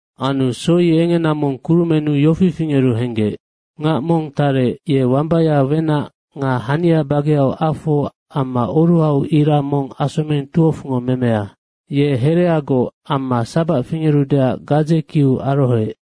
Anu soi engena mong kurumennu yofi fingeru henggec. Ngac mong tarec, ye wambaya wenac nga hania bageau afo amma oruhau ira mong asomeng 12ngo memea. Ye hereagoc amma sabac fingerudeac gadze kiu arohoec.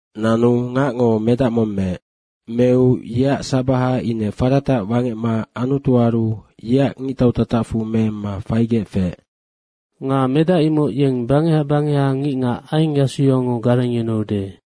Nanu ngacngo medac mong meec. Meu yeac sabaha ine faratac wangecma Anutuaru, yeac ngictau tatacfu meemma faigec feec. Nga medac imoc, yeng bangeha bangeha ngicngac aiengyasungo garengyunuude.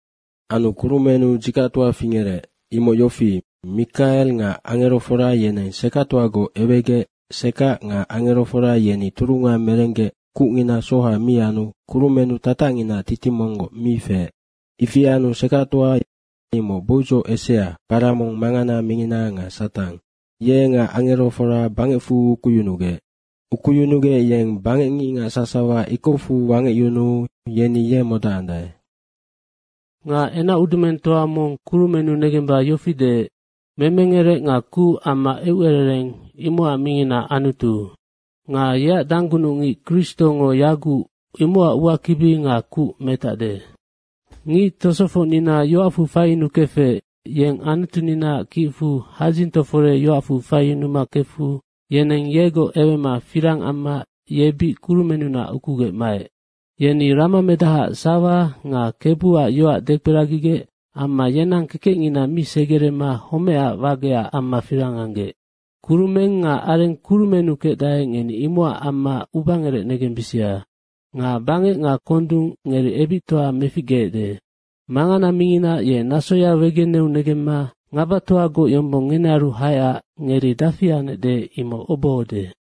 Anu kurumennu dzikactoa fingerec. Imoc yofi, Mikae nga angerofora yeneng sekactoagoc ewegec sekac nga angerofora yeni turunga merenggec kucngina soha mi anu kurumennu tatacnginaac titing monggoc mi feec. If anu sekactoa, imoc boudzoc esea kpara mong Mangana mingina nga Satang, ye nga angerofora bangecfu ukuyunugec. Ukuyunugec yeng bangecngicngac sasawa ikocfu wangecyunuu yeni ye modacandae. Nga enacudumengtoa mong kurumennu negemba yofi deec, “Memengerec nga kuc amma eucerereng imocac mingina Anutu. Nga yeac danggunucngic Kristongo yaguc imocac uakibi nga kuc metacde. Ngic tosofocnina yoacfu faiyunukefec, yeng Anutuninaac kicfu hadzing toforec yoacfu faiyunuma kefu yeneng yegoc ewema firang amma ye bic kurumennunac ukugec maec. Yeni ramamedahaac sawa nga Kebuac yoac dekperagigec amma yenang kekecngina mi segerema homecac wagecac amma firang anggec. Kurumeng nga areng kurumennu kecdae, ngeni imocac amma ubangerec negembisia. Nga bangec nga kondung ngeri ebictoa meficgeecde. Mangana mingina ye nasoya wegeneu negemma ngabatoagoc yombong ngenearu haecac ngeri dafi anecde, imoc obohode.”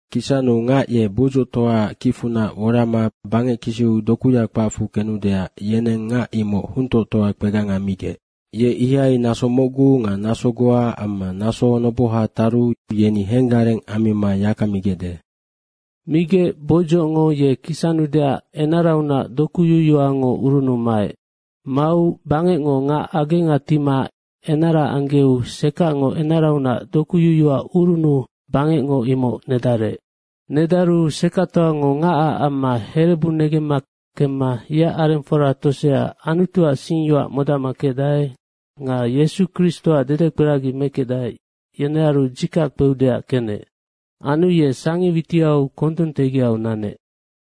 Kisanu ngac ye boudzoctoaac kicfunac worama bangec kisiu dokuya kpacfu kenudeac yeneng ngac imoc huntoctoa kpeganga migec. Ye ihai naso mocgu nga naso goa amma naso noboha taru yeni henggareng ammima yaka migecde. Migec boudzocngo ye kisanudeac enaraunac dokuyuyuango urunu maec. Mau bangecngo ngac agenga tima enara anggeu sekacngo enaraunac dokuyuyua urunu bangecngo imoc nedarec. Nedaru sekactoango ngacac amma herebu negemma kemma yeac arengfora tosea Anutuac singyoac modacma kecdae nga Yesu Kristoac dedekperagi mekecdae, yenearu dzikac kpeudeac kenec. Anu ye sangi witiau kondung tegiau nanec.